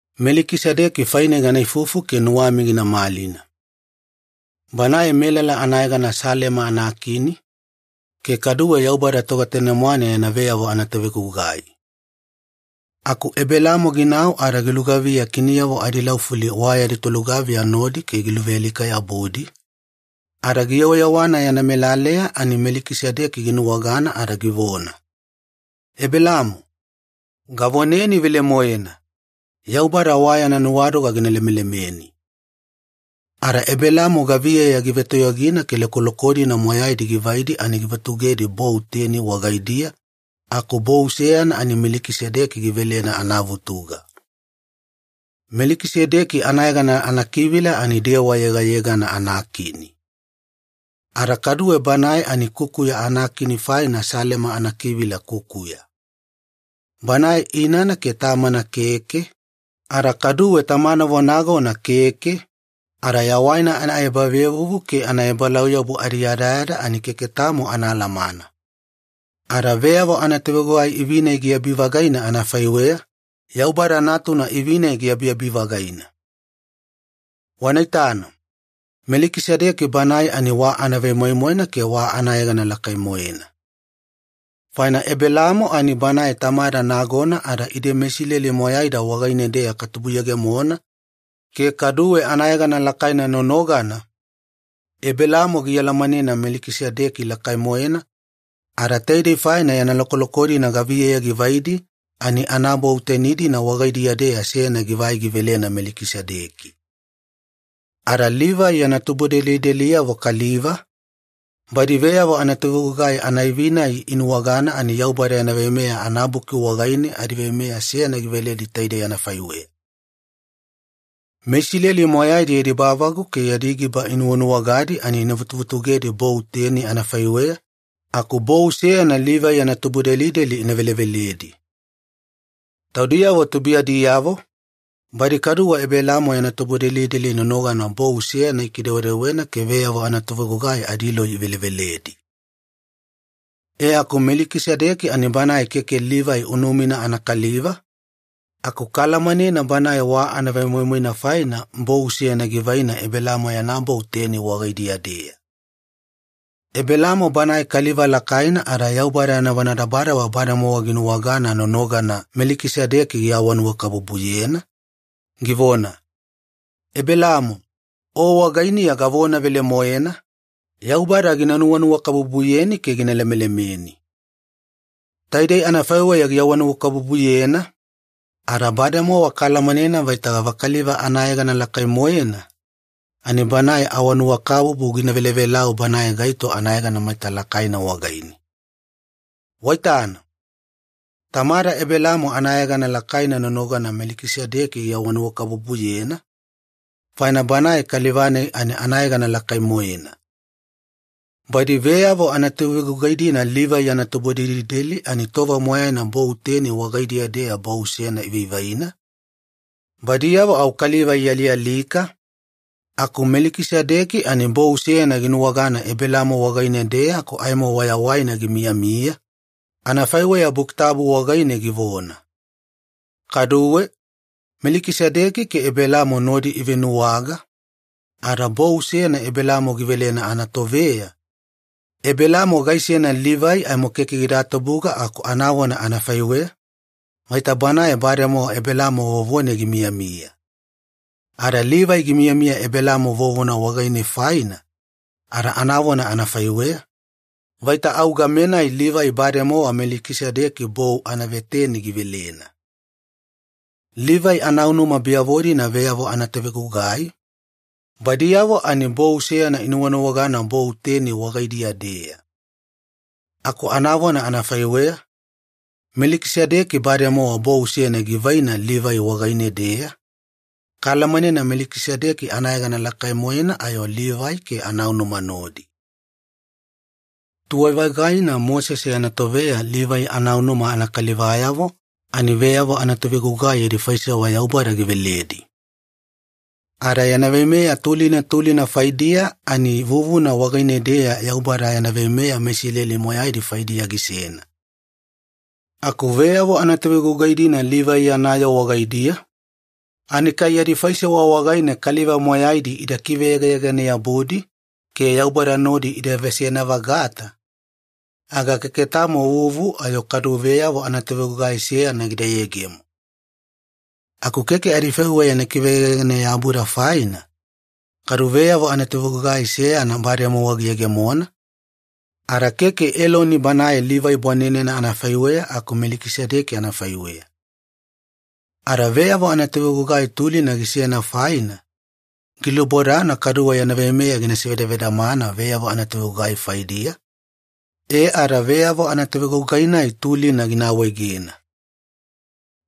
Melikisedeki faine gana ifufu ke nuwami gina malina. Banae melala anayegana Salema anakini, ke kaduwe Yaubada Togetanemwane yana veyavo anatovegugai. Aku Ebelaamo ginau ada gilugaviya kiniyavo adilaufuli wa yadi tolugaviya nodi ke giluvealika-yabudi, ada giyewayewana yana melaleya ani Melikisedeki ginuwagana ada givona, “Ebelaamo, gavoneni velemoena, Yaubada wa yana nuwadoga gina lemelemeni.” Ada Ebelaamo gaviyeya givetoyogina ke lokoloko-dina moyaina givaidi ani givutugedi bou teni wagaidiya aku bou seyana ani Melikisedeki givelena anavutuga. Melikisedeki anayegana anakivila ani ‘dewa yegayegana anakini’. Ada kaduwe banae ani ‘kukuya anakini’ faina ‘Salema’ anakivila ‘kukuya’. Banae inana ke tamana keke, ada kaduwe tamanavo nagona keke, ada yawaina anaebavevuvu ke anaebalauyabu adiyadayada ani keke tamo anaalamana. Ada veyavo anatovegugai ivi-nai giabi-vagaina anafaiweya, Yaubada Natuna ivi-nai giabiabi-vagaina. Wana itana, Melikisedeki banae ani wa anavemoimoina ke wa anayegana lakai-moena. Faina Ebelaamo ani banae tamada nagona ada ide meIsileli moyaida wagaine-deya katubuyegemona ke kaduwe anayegana lakaina nonogana, Ebelaamo gialamanena Melikisedeki lakai-moena, ada taidei faina yana lokoloko-dina gaviyeya givaidi, ani anabou teni-dina wagaidiya-deya seyana givai givelena Melikisedeki. Ada Livai yana tubudelideliyavo kaliva, badi veyavo anatovegugai anaivi-nai inuwagana ani Yaubada yana Veimeya anabuki wagaine adiveimeya seyana giveledi taidei anafaiweya. MeIsileli moyaidi yadi bavagu ke yadi giba inuwanuwagadi ani ina vutuvutugedi bou teni anafaiweya, aku bou seyana Livai yana tubudelideli ina veleveledi. Taudiyavo tubuiyadiyavo, badi kaduwe Ebelaamo yana tubudelideli nonogana bou seyana ikidewedewena ke veyavo anatovegugai adiloi iveleveledi. E aku Melikisedeki ani banae keke Livai unumina anakaliva, aku kaalamanena banae wa anavemoimoina faina bou seyana givaina Ebelaamo yana bou teni wagaidiya-deya. Ebelaamo banae kaliva lakaina ada Yaubada yana vonadabadaba bademowa ginuwagana nonogana Melikisedeki giawanuwakabubuyena, givona, “Ebelaamo, o wagainiya gavona velemoena, Yaubada gina nuwanuwakabubuyeni ke gina lemelemeni.” Taidei anafaiweya giawanuwakabubuyena, ada bademowa kaalamanena vaita gavakaliva anayegana lakai-moena, ani banae awanuwakabubu gina velavelau banae gaito anayegana maita lakaina wagaine. Waitana? Tamada Ebelaamo anayegana lakaina nonogana Melikisedeki giawanuwakabubuyena, faina banae kaliva-nai ani anayegana lakai-moena. Badi veyavo anatovegugai-dina Livai yana tubudelideli ani tova moyaina bou teni wagaidiya-deya bou seyana ivaivaina, badiyavo au kaliva ialialika, aku Melikisedeki ani bou seyana ginuwagana Ebelaamo wagaine-deya aku aimo wayawaina gimiyamiya, anafaiweya Buki Tabu wagaine givona. Kaduwe, Melikisedeki ke Ebelaamo nodi ivenuwaga, ada bou seyana Ebelaamo givelena anatoveya, Ebelaamo gaisena Livai aimo keke gida tubuga aku anavona anafaiweya, vaita banae bademowa Ebelaamo vovone gimiyamiya. Ada Livai gimiyamiya Ebelaamo vovona wagaine faina, ada anavona anafaiweya, vaita au game-nai Livai bademowa Melikisedeki bou anaveteni givelena. Livai anaunuma biyavo-dina veyavo anatovegugai, badiyavo ani bou seyana inuwanuwagana bou teni wagaidiya-deya. Aku anavona anafaiweya, Melikisedeki bademowa bou seyana givaina Livai wagaine-deya, kaalamanena Melikisedeki anayegana lakai-moena ayo Livai ke anaunuma nodi. Tuwai-vagaina Mosese yana toveya Livai anaunuma anakalivayavo ani veyavo anatovegugai yadi faisewa Yaubada giveledi. Ada yana veimeya tulina tulina faidiya ani vuvuna wagaine-deya Yaubada yana veimeya meIsileli moyaidi faidiya gisena. Aku veyavo anatovegugai-dina Livai yana yoo wagaidiya, ani kai yadi faisewa wagaine kaliva moyaidi ida kiveyegayegane-yabudi ke Yaubada nodi ida veseyana-vagata, aga keke tamo vuvu ayo kadu veyavo anatovegugai seyana gida yegemo. Aku keke adifaiweya ina kiveyegayegane-yabuda faina, kadu veyavo anatovegugai seyana bademowa giyegemona, ada keke Eloni banae Livai bwanenena anafaiweya aku Melikisedeki anafaiweya. Ada veyavo anatovegugai tulina gisena faina, gilubodana kaduwe yana veimeya gina sivedavedamana veyavo anatovegugai faidiya, e ada veyavo anatovegugai-nai tulina gina awaegena.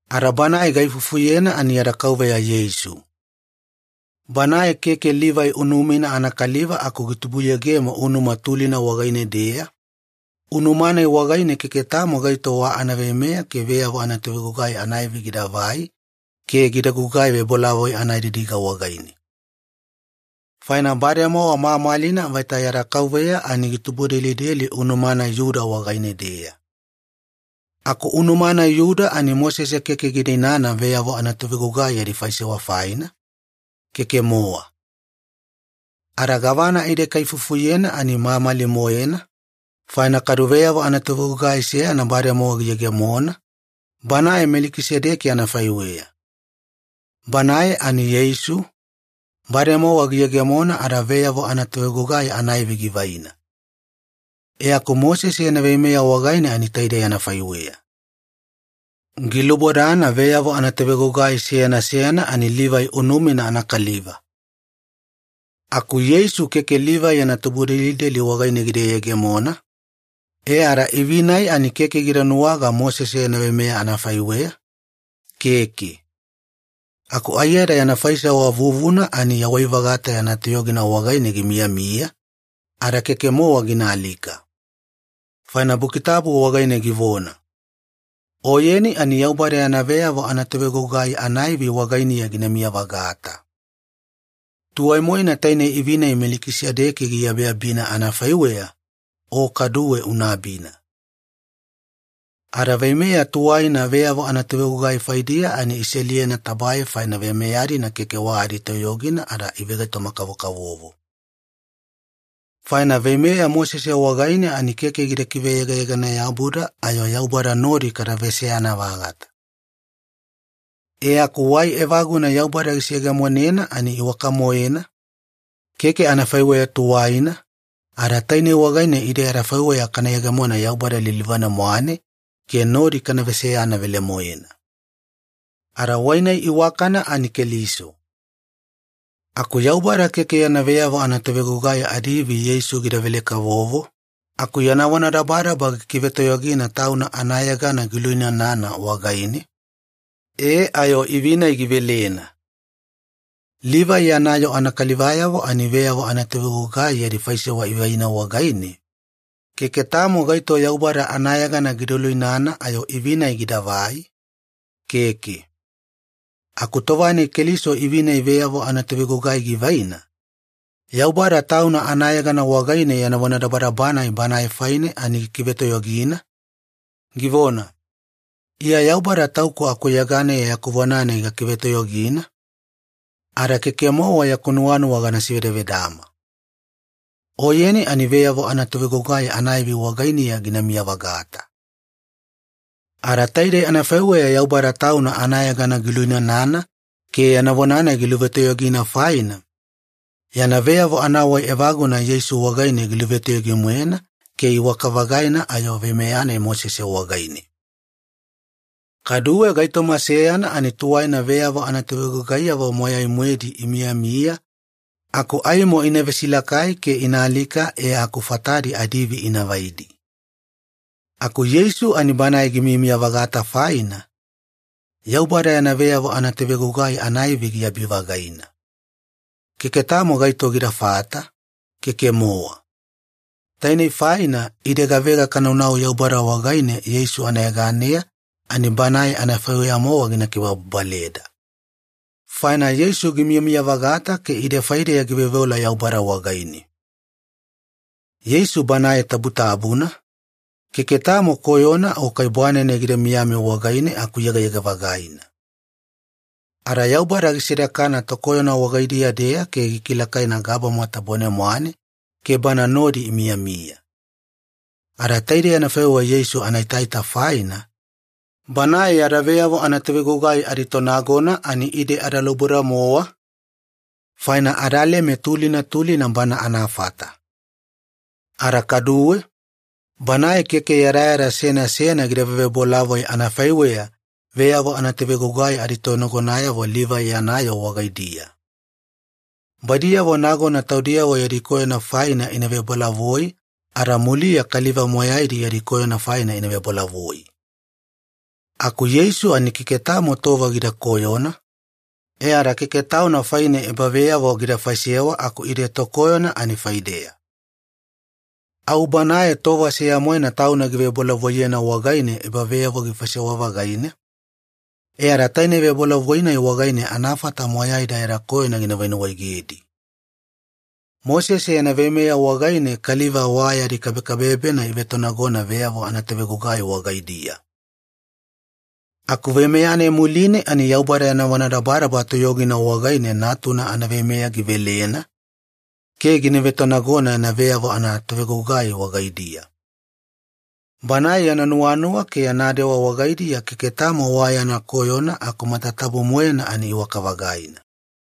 Ada Banae gaifufuyena ani yada Kauveya Yeisu. Banae keke Livai unumina anakaliva aku gitubuyegemo unuma tulina wagaine-deya, unuma-nai wagaine keke tamo gaito wa anaveimeya ke veyavo anatovegugai anaivi gidavai ke gida gugai vebolavoi anadidiga wagaine. Faina bademowa mamalina vaita yada Kauveya ani gitubudelideli unuma-nai Iyuda wagaine-deya. Aku unuma-nai Iyuda ani Mosese keke gida inana veyavo anatovegugai yadi faisewa faina, keke-mowa. Ada gavana ide kaifufuyena ani mamali-moena, faina kadu veyavo anatovegugai seyana bademowa giyegemona, Banae Melikisedeki anafaiweya. Banae ani Yeisu, bademowa giyegemona ada veyavo anatovegugai anaivi givaina. E aku Mosese yana veimeya wagaine ani taidei anafaiweya. Gilubodana veyavo anatovegugai seyana seyana ani Livai unumina anakaliva. Aku Yeisu keke Livai yana tubudelideli wagaine gida yegemona, e ada ivi-nai ani keke gida nuwaga Mosese yana veimeya anafaiweya, keke. Aku aiyada yana faisewa vuvuna ani yawai-vagata yana toyogina wagaine gimiyamiya, ada keke-mowa gina alika. Faina Buki Tabu wagaine givona, “Oyeni ani Yaubada yana veyavo anatovegugai anaivi wagainiya ginamiya-vagata. Tuwai-moena tainei ivi-nai Melikisedeki giabiabina anafaiweya, O kaduwe una abina.” Ada veimeya tuwaina veyavo anatovegugai faidiya ani iseliyedi tabae, faina veimeya-dina keke wa yadi toyogina ada ivegaitoma-kavokavovo. Faina veimeya Mosese wagaine ani keke gida kiveyegayegane-yabuda ayo Yaubada nodi kada veseyana-vagata. E aku wai evaguna Yaubada giseyegemonena ani iwaka-moena, keke anafaiweya tuwaina, ada tainei wagaine ide adafaiweya kana yegemona Yaubada lilivane-mwane ke nodi kana veseyana velemoena. Ada wai-nai iwakana ani Keliso. Aku Yaubada keke yana veyavo anatovegugai adiivi Yeisu gidavele-kavovo, aku yana vonadabadaba gikivetoyogina Tauna anayegana giluinanana wagaine, e ayo ivi-nai givelena. Livai yana yoo anakalivayavo ani veyavo anatovegugai yadi faisewa ivaina wagaine, keke tamo gaito Yaubada anayegana gida luinana ayo ivi-nai gidavai, keke. Aku tova-nai Keliso ivi-nai veyavo anatovegugai givaina, Yaubada Tauna anayegana wagaine yana vonadabadaba-nai Banae faine ani gikivetoyogina, givona, “Iya Yaubada Tauku akuyeganeya yaku vona-nai gakivetoyogina, ada keke-mowa yaku nuwanuwa gana sivedavedama. Oyeni ani veyavo anatovegugai anaivi wagainiya ginamiya-vagata.” Ada taidei anafaiweya Yaubada Tauna anayegana giluinanana ke yana vona-nai giluvetoyogina faina, yana veyavo anawai evaguna Yeisu wagaine giluvetoyogi-moena, ke iwaka-vagaina ayo veimeya-nai Mosese wagaine. Kaduwe gaitoma seyana ani tuwaina veyavo anatovegugaiyavo moyai-moedi imiyamiya, aku aimo ina vesilakai ke ina alika e aku fatadi adiivi ina vaidi. Aku Yeisu ani Banae gimiyamiya-vagata faina, Yaubada yana veyavo anatovegugai anaivi giabi-vagaina. Keke tamo gaito gidafata, keke-mowa. Tainei faina ide gavega kanaunau Yaubada wagaine Yeisu anayeganeya, ani Banae anafaiweya-mowa gina kibababaleda. Faina Yeisu gimiyamiya-vagata ke ide faideya giveoveola Yaubada wagaine. Yeisu Banae tabutabuna, keke tamo koyona o kai bwanenene gida miyami wagaine aku yegayega-vagaina. Ada Yaubada gisedakana tokoyona wagaidiya-deya ke gikilakaina gabama tabone-mwane ke Bana nodi imiyamiya. Ada taidei anafaiweya Yeisu anaitaita faina, Banae yada veyavo anatovegugai aditonagona ani ide adalauboda-mowa, faina adaleme tulina tulina Bana anafata. Ada kaduwe, Banae keke yadayada seyana seyana gida vevebolavoi anafaiweya veyavo anatovegugai aditonagonayavo Livai yana yoo wagaidiya. Badiyavo nagona taudiyavo yadi koyona faina ina vebolavoi, ada muliya kaliva moyaidi yadi koyona faina ina vebolavoi. Aku Yeisu ani keke tamo tova gida koyona, e ada keke Tauna faine ebaveyavo gida faisewa aku ide tokoyona ani faideya. Au Banae tova seya-moena Tauna givebolavoiyena wagaine ebaveyavo gifaisewa-vagaina, e ada tainei vebolavoi-nai wagaine anafata moyaida yada koyona gina venuwaegedi. Mosese yana veimeya wagaine kaliva wa yadi kabekabebena ivevetonagona veyavo anatovegugai wagaidiya. Aku veimeya-nai muline ani Yaubada yana vonadabadaba toyogina wagaine Natuna anaveimeya givelena ke gina vetonagona yana veyavo anatovegugai wagaidiya. Banae yana nuwanuwa ke yana dewa wagaidiya keke tamo wa yana koyona aku matatabu-moena ani iwaka-vagaina.